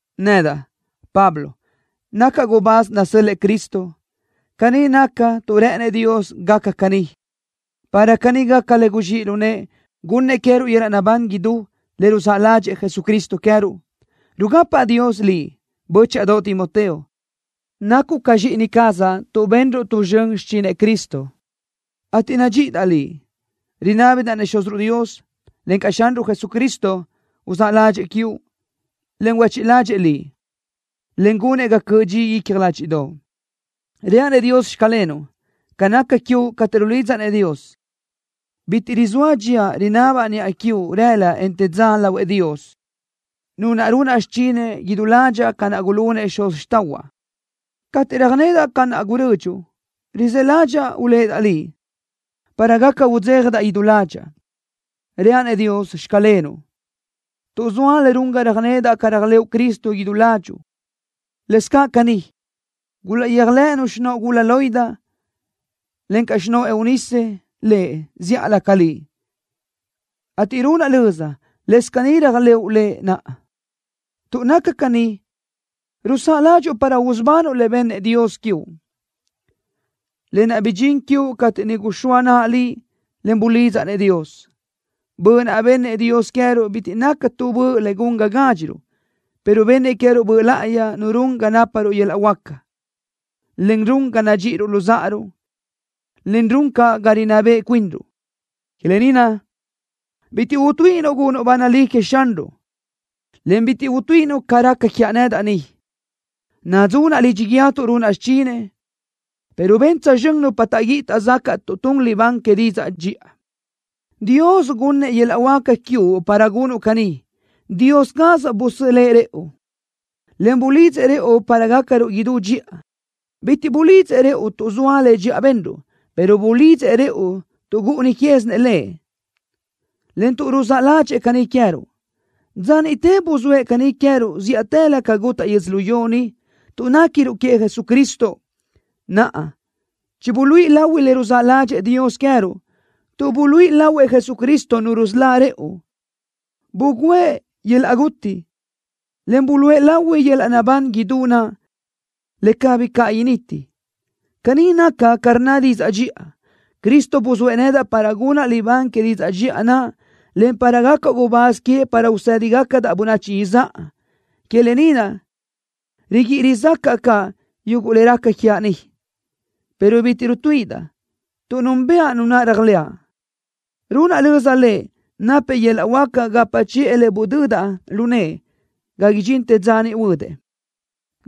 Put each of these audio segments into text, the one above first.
Nedaʼ, Pablo, nacaʼ gubáz nasö́l-lëʼë Cristo. Caní nacaʼ tuʼ rë́ʼënëʼ Dios gacaʼ caní, para caní gaca le guzxíʼ lu nëʼë, gunnëʼ queë́ruʼ yöl-laʼ naʼbán idú, le ruzáʼ ládxëʼë Jesucristo queë́ruʼ. Rugapaʼ Dios liʼ, bö́chaʼadoʼ Timoteo. Nacuʼ ca zxíʼini cazaʼ tuʼ benruʼ tu zxön xichinëʼ Cristo, ateʼ nadxíʼidaʼ liʼ. Rinábidaʼ-nëʼ Xúziruʼ Dios, encaʼ Xanruʼ Jesucristo, uzáʼ ládxëʼë quiuʼ, en huéchiʼ ládxëʼë liʼ, en gunëʼ ga cöʼ dxi icja ládxiʼdoʼo. Reaʼ-nëʼ Dios: “Xclenuʼ” ca naca quiuʼ cateʼ rulidzaʼ-nëʼ Dios. Bitiʼ rizóa dxíaʼ rinabaʼ niʼa quiuʼ rëla, en te dza lahuëʼ Dios, Nu naʼ runaʼ xichinëʼ idú ládxaʼa ca naʼ gulunëʼ xuz xtáʼahuaʼ. Cateʼ röjnedaʼ ca naʼ gurödxuʼ, rizë́ ládxaʼa uléʼedaʼ liʼ, para gaca udzéjadaʼ idú ládxaʼa. Reaʼ-nëʼ Dios: “Xclenuʼ” tuʼ zoa le run ga röjnedaʼ ca réajlëʼu Cristo idú ládxuʼu. Lëscaʼ caní, gulaʼyéajlëʼënu xinóʼo gula Loida, encaʼ xinóʼo Eunice Lëʼ zíʼalö ca liʼ, ateʼ runaʼ löza, lëscaʼ caní réajlëʼu Lëʼ naʼa. Tuʼ naca caní, rusáʼa ládxuʼu para usubanuʼ le bennëʼ Dios quiuʼ, lë naʼ bidxín quiuʼ cateʼ niʼ guxóa naʼa liʼ, en bulidzaʼ-nëʼ Dios. Böʼ naʼ bennëʼ Dios queë́ruʼ bitiʼ naca tu böʼ le gun ga gádxiruʼ, pero bennëʼ queë́ruʼ Böʼ Láʼayi Nu run ga náparuʼ yöl-laʼ huáca, en run ga nadxíʼiruʼ luzáʼaruʼ, en run caʼ ga rinná beʼe cuinruʼ. Que lë ni naʼ, bitiʼ utuíʼinuʼ gunuʼ ba nalí queëʼ Xanruʼ, en bitiʼ utuíʼinuʼ ca raca quiaʼ nedaʼ ni, nadzunaʼ lidxi guíë tuʼ runaʼ xichinëʼ, pero ben tsözxö́n nupa taʼguíʼi taʼzacaʼ tuʼ tun libán que didzaʼ dxiʼa. Dios gunnëʼ yöl-laʼ huáca quiuʼ para gunuʼ caní. Dios caz busölë́ʼ rëʼu, en bulidzëʼ rëʼu para gácaruʼ idú dxiʼa. Bitiʼ bulidzëʼ rëʼu tuʼ zoa le dxiʼa benruʼ, pero bulidzëʼ rëʼu tuʼ gúʼuni quézinëʼ Lëʼ, en tuʼ ruzáʼ ládxëʼë caní queë́ruʼ. Dza niʼte buzóëʼ caní queë́ruʼ zíʼatëlö ca gutaʼ yödzölió ni, tuʼ néquiruʼ queëʼ Jesucristo. Naʼa, chibuluíʼi lahui le ruzáʼ ládxëʼë Dios queë́ruʼ, tuʼ buluíʼi lahuëʼ Jesucristo Nu rusölá rëʼu. Bugǘëʼ yöl-laʼ guti, en buluʼe lahui yöl-laʼ naʼbán idú naʼ, le cabí caʼ initi. Caní naca ca rnna didzaʼ dxiʼa. Cristo buzóëʼ nedaʼ para gunaʼ libán que didzaʼ dxiʼa naʼ, en para gacaʼ gubáz queëʼ para usë́digacadaʼ bönachi izáʼa. Que lë ni naʼ riguíʼi rizácaʼa caʼ yuguʼ le raca quiaʼ ni, pero bitiʼ rutuíʼidaʼ, tuʼ núnbëʼa Nu naʼ réajlëʼa. Runaʼ löza Lëʼ, napëʼ yöl-laʼ huáca gapa chiʼë le budödaʼ lu nëʼë ga idxintë dza niʼ huödëʼ.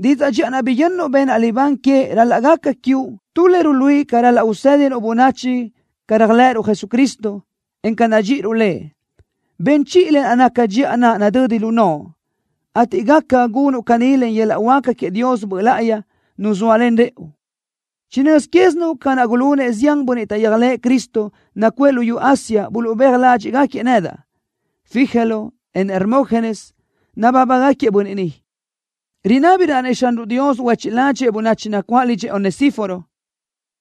Didzaʼ dxiʼa naʼ biyönnuʼ benaʼ libán que ral-laʼ gaca quiuʼ tu le ruluíʼi ca ral-laʼ usédinuʼ bönachi ca réajlëʼëruʼ Jesucristo, en ca nadxíʼiruʼ Lëʼ. Ben chiʼi le naca dxiʼa naʼ nadödi lu noʼo, ateʼ gaca gunuʼ caní len yöl-laʼ huáca queëʼ Dios Böʼ Láʼayi, Nu zóalen rëʼu. Chinö́z quézinuʼ ca naʼ gulunëʼ zian bönniʼ taʼyéajlëʼë Cristo nacuʼë luyú Asia buluʼbéaj ládxiʼgaquiëʼ nedaʼ. Figelo, en Hermógenes nabábagaquiëʼ bönniʼ ni. Rinábidaʼ-nëʼ Xanruʼ Dios huéchiʼ ládxëʼë bönachi nacuáʼ lidxëʼ Onesíforo,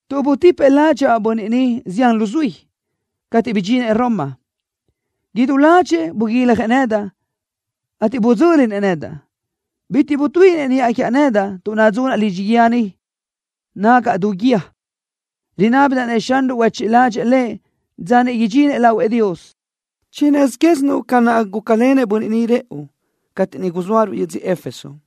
tuʼ butipëʼ ládxaʼa bönniʼ ni zián luzuí. Cateʼ bidxinëʼ Roma, idú ládxëʼë buguiljëʼ nedaʼ, ateʼ budzö́linëʼ nedaʼ. Bitiʼ butuíʼinëʼ niʼa quiaʼ nedaʼ tuʼ nadzunaʼ lidxi guíë ni, nágaʼa du guíë. Rinábidaʼ-nëʼ Xanruʼ huéchiʼ ládxëʼë lëʼ dza niʼ idxinëʼ lahuëʼ Dios. Chinö́z quézinuʼ ca naʼ gúcalenëʼ bönniʼ ni rëʼu, cateʼ niʼ guzóaruʼ yödzö Éfeso.